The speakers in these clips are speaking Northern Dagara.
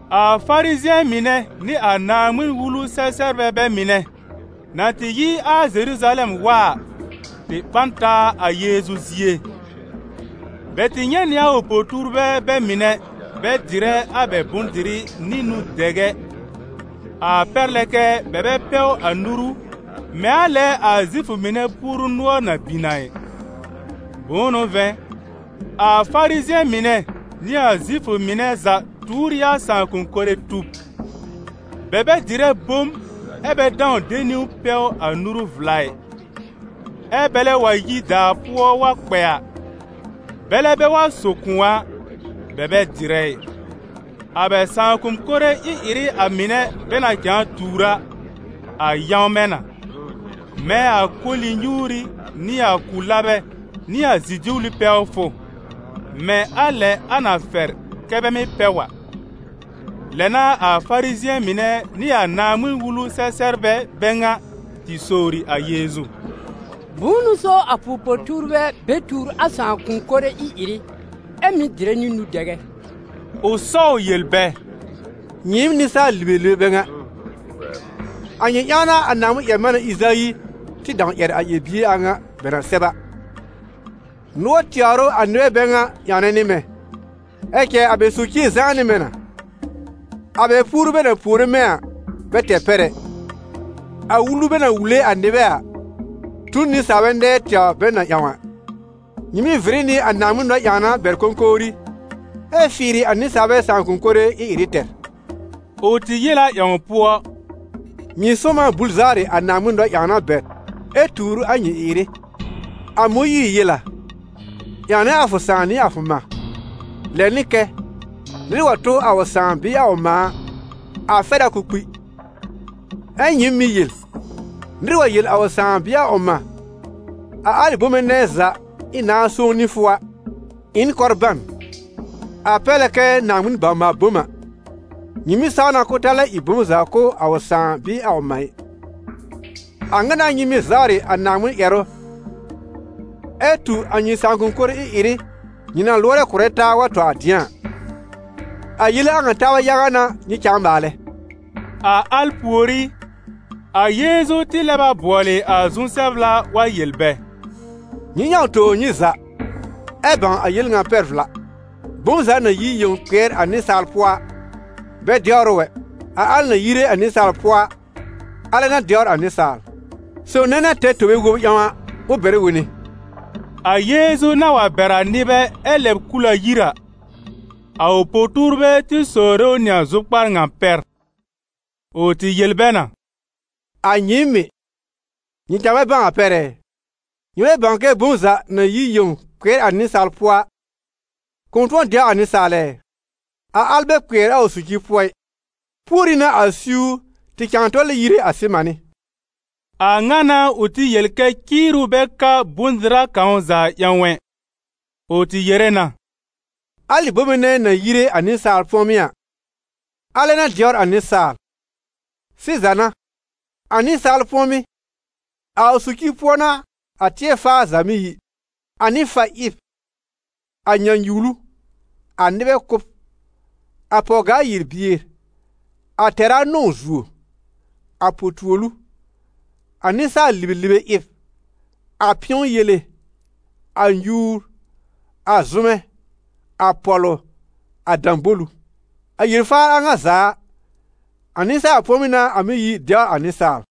A Farizɩ̃ɛ mɩnɛ nɩ a Naaŋmɩn-Wulu-sɛ-sɛbrbɛ bɛ mɩnɛ, na tɩ yi a Zeruzalɛm wa a, tɩ ɓã n taa a Yeezu zie. Bɛ tɩ nyɛ̃ nɩ a ʋ po-tuurbɛ bɛ mɩnɛ bɛ dɩrɛ a bɛ bʋ̃-dɩrɩ nɩ nũ-dɛgɛ, a pɛr lɛ kɛ bɛ bɛ pɛw a nuru mɛ̃ a lɛ a Zifʋ mɩnɛ puoru nʋɔr na bin a ɩ. Bʋ̃ʋ n'ʋ vɛ̃, a Farizɩ̃ɛ mɩnɛ nɩ a Zifʋ mɩnɛ za tuur ɩ a sãakʋ̃-kore tub: bɛ bɛ dɩrɛ bom, ɛ́ bɛ dãw de niwn pɛw a nuru vla ɩ; ɛ́ bɛlɛ wa yi daa pʋɔ wa kpɛ a, bɛlɛ bɛ wa so kʋ̃ɔ a, bɛ bɛ dɩrɛ ɩ. A bɛ sãakʋ̃-kore ɩ-ɩrɩ a mɩnɛ bɛ na cãa tuur a, a yãwmɛ̃ na: mɛ̃ a koli-nyuuri nɩ a ku-labɛ nɩ a zi-duwli pɛwfʋ, mɛ̃ a lɛ a na fɛr kɛ bɛ mɩ́ pɛw a. Lɛ n'a a Farizɩ̃ɛ mɩnɛ nɩ a Naaŋmɩn-Wulu-sɛ-sɛbrbɛ bɛ ŋa tɩ sowri a Yeezu: «Bʋ̃ʋ n'ʋ so a fʋ po-tuurbɛ bɛ tuur a sãakʋ̃-kore ɩ-ɩrɩ ɛ mɩ́ dɩrɛ nɩ nũ-dɛgɛ?» Ʋ sɔw yel bɛ: «Nyɩɩm nɩsaal-libelibe bɛ ŋa! A nyɩ ƴãw n'a a Naaŋmɩn-ƴɛr-manɛ Ɩzayi tɩ dãw ƴɛr a ƴɛr-bie a ŋa bɛ na sɛb a: ‹Nʋɔr tɛwr ʋ a nɩbɛ bɛ ŋa ƴãwnɛ nɩ mɛ̃, ɛ cɛ a bɛ socie zãá nɩ mɛ̃ na. A bɛ puoru bɛ na puore mɛ̃ a, bɛ tɛr pɛr ɛ, a wulu bɛ na wule a nɩbɛ a, tu n nɩsaalbɛ nɛɛ tɛwr bɛ na ƴãw a.› Nyɩ mɩ́ vɩrɩ nɩ a Naaŋmɩn nɔ-ƴãwna bɛr kõkowri, ɛ fɩɩrɩ a nɩsaalbɛ sãakʋ̃-kore ɩ-ɩrɩ tɛr.» Ʋ tɩ yel a ƴãw pʋɔ: «Nyɩ sʋ̃ɔm a bul zawrɩ a Naaŋmɩn nɔ-ƴãwna bɛr ɛ tuur a nyɩ ɩ-ɩrɩ. A Mõyiir yel a: ‹Ƴãwnɛ a fʋ sãà nɩ a fʋ mã.› Lɛ nɩ kɛ: ‹Nɩr wa tʋ a ʋ sãà bɩɩ a ʋ mã a, a fɛr a k'ʋʋ kpi.› Ɛ nyɩɩm mɩ́ yel: ‹Nɩr wa yel a ʋ sãà bɩɩ a ʋ mã: a alɩ bome nɛ za ɩ̃ nãa sõw nɩ fʋ a, ɩ n kɔrban›, a pɛr lɛ kɛ Naaŋmɩn bawr-maal-bom a, nyɩ mɩ́ saw na k'ʋʋ ta lɛ ɩ bom za kʋ̀ a ʋ sãà bɩɩ a ʋ mã ɩ. A ŋa n'a nyɩ mɩ́ zawrɩ a Naaŋmɩn ƴɛrʋ, ɛ tu a nyɩ sãakʋ̃-kore ɩ-ɩrɩ nyɩ na lʋɔrɛ kʋ̀rɛ taa wa tɔ a dɩ̃a a. A yele a ŋa taabɛ yaga n'a nyɩ cãa maalɛ.» A al pùorí, a Yeezu tɩ lɛb a bʋɔlɩ a zu-sɛbla wa yel bɛ: «Nyɩ ƴãw tobr nyɩ za, ɛ bãw a yel ŋa pɛr vla: bom za na yi yẽw kpɩɛr a nɩsaal pʋɔ a, bɛ dɛwr ʋ ɛ, a al na yire a nɩsaal pʋɔ a, alɛ n'a dɛwr a nɩsaal.» [ Sob nɛ na tɛr tobe wob ƴãw a, ʋ bɛrɛ wone.] A Yeezu na wa bɛr a nɩbɛ ɛ lɛb kul a yir a, a ʋ po-tuurbɛ tɩ sowre ʋ nɩ a zʋkpar ŋa pɛr. Ʋ tɩ yel bɛ na: «A nyɩɩm mɩ̀, nyɩ cãa bɛ bãw a pɛr ɛ? Nyɩ bɛ bãw kɛ bom za na yi yẽw kpɩɛr a nɩsaal pʋɔ a, kʋ̃ tʋ̃ɔ dɛw a nɩsaal ɛ? A al bɛ kpɩɛr a ʋ socir pʋɔ ɩ, púorí n'a a siwr tɩ cãa tɔlɛ yire a sɩmanɩ́!» A ŋa n'a ʋ tɩ yel kɛ ciiru bɛ ka bʋ̃-dɩra kãw za ƴãw ɛ. Ʋ tɩ yere na: «Alɩ bome nɛ na yire a nɩsaal pʋ̃ɔmɩ́ a, alɛ n'a dɛwr a nɩsaal. Sɩza n'a, a nɩsaal pʋ̃ɔmɩ́, a ʋ socir pʋɔ n'a a tɩɛr-faar za mɩ́ yi: a nɩ-fa-ɩb, a nyãnyuwlu, a nɩbɛ kʋ́b, a pɔw-gaa-yel-bier, a tɛra-nɔ̃w-zuo, a po-tuolu, a nɩsaal-libelibe ɩb, a pɩ̃ɔ yele, a nyuur, a zʋmɛ, a pɔ̀lʋ, a dãbolu. A yel-faar a ŋa za a, a nɩsaal pʋ̃ɔmɩ́ n'a a mɩ́ yi dɛwr a nɩsaal.»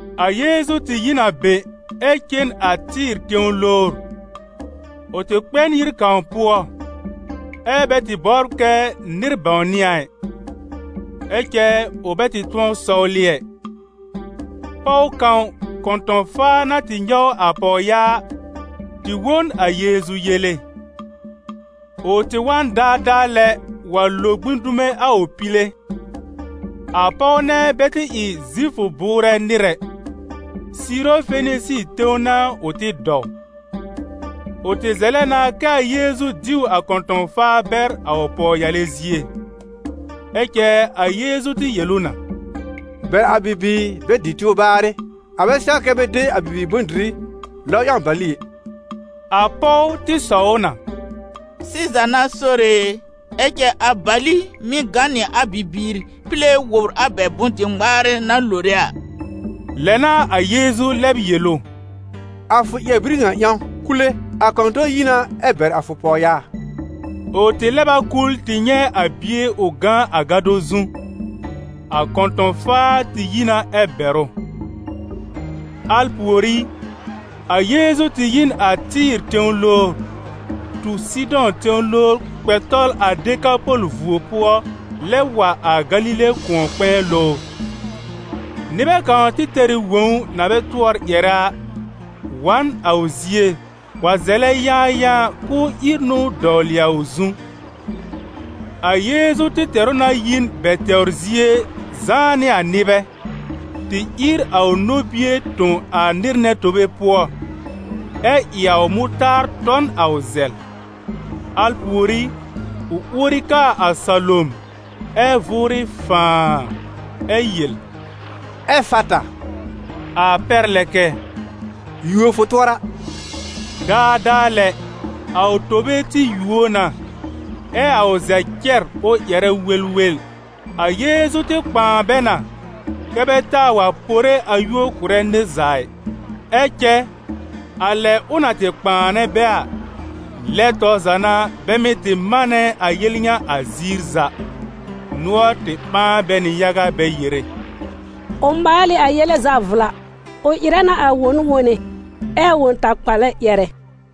A Yeezu tɩ yi n a be, ɛ cen a Tɩ́ɩ̀r tẽw lowr. Ʋ tɩ kpɛ n yir kãw pʋɔ, ɛ́ bɛ tɩ bɔbr kɛ nɩr bãwnɩ a ɩ. Ɛ cɛ ʋ bɛ tɩ tʋ̃ɔ sɔwlɩ ɛ. Pɔw kãw, kɔ̃tɔ̃-faa na tɩ nyɔw a pɔwyaa a, tɩ wõ n a Yeezu yele. Ʋ tɩ wa n daadaa lɛ wa lo gbĩ dume a ʋ pile. A pɔw nɛ bɛ tɩ ɩ Zifʋ bʋʋrɛ nɩr ɛ, Siiro-Fenisi tẽw n'a ʋ tɩ dɔw. Ʋ tɩ zɛlɛ na kɛ a Yeezu diw a kɔ̃tɔ̃-faa bɛr a ʋ pɔwyale zie. Ɛ cɛ a Yeezu tɩ yel ʋ na: «Bɛr a bibiir bɛ dɩ tɩw baarɩ, a bɛ sɛw kɛ bɛ de a bibiir bʋ̃-dɩrɩ lɔb ƴãw bali ɛ.» A pɔw tɩ sɔw ʋ na: «Sɩza n'a Sore e, ɛ cɛ a bali mɩ́ gã nɩ a bibiir pile wobr a bɛ bʋ̃-dɩ-ŋmaarɛ na lore a.» Lɛ n'a a Yeezu lɛb yel ʋ: «A fʋ ƴɛr-bir ŋa ƴãw, kule, a kɔ̃tɔ̃n yi na ɛ bɛr a fʋ pɔwyaa.» Ʋ tɩ lɛb a kul tɩ nyɛ̃ a bie ʋ gã a gado zu. A kɔ̃tɔ̃-faa tɩ yi na ɛ bɛr ʋ. Al pùorí, a Yeezu tɩ yi n a Tɩ́ɩ̀r tẽw lowr, tu Sɩdɔ̃ tẽw lowr kpɛ tɔl a Dekapɔl vuo pʋɔ lɛb wa a Galile kʋ̃ɔ-kpɛ̃ɛ lowr. Nɩbɛ kãw tɩ tɛr ɩ wõw na bɛ tʋɔr ƴɛrɛ a, wa n a ʋ zie wa zɛlɛ yãayãa k'ʋʋ ír nũu dɔwlɩ a ʋ zu. A Yeezu tɩ tɛr ʋ na yi n bɛ tɛwr zie zãá nɩ a nɩbɛ, tɩ ír a ʋ nobie tõ a nɩr nɛ tobe pʋɔ, ɛ ɩ a ʋ mʋtaar tɔ n a ʋ zɛl. Al pùorí ʋ uori kaa a salom, ɛ́ vʋʋrɩ fãaa! Ɛ yel: «Ɛfata!» a pɛr lɛ kɛ: «Yuo fʋ tʋɔra!» Daadaa lɛ, a ʋ tobe tɩ yuo na, ɛ a ʋ zɛl cɛr ʋ ƴɛrɛ welwel. A Yeezu tɩ kpãa bɛ na kɛ bɛ taa wa pore a yúor kʋ̀rɛ nɩr za ɩ. Ɛ cɛ a lɛ ʋ na tɩ kpãanɛ bɛ a, lɛ tɔr za n'a bɛ mɩ́ tɩ manɛ a yel ŋa a ziir za. Nʋɔr tɩ ɓãa bɛ nɩ yaga bɛ yere: «Ʋ maal ɩ a yele za vla. Ʋ ɩrɛ na a won wone, ɛ a wõ-takpalɛ ƴɛrɛ.»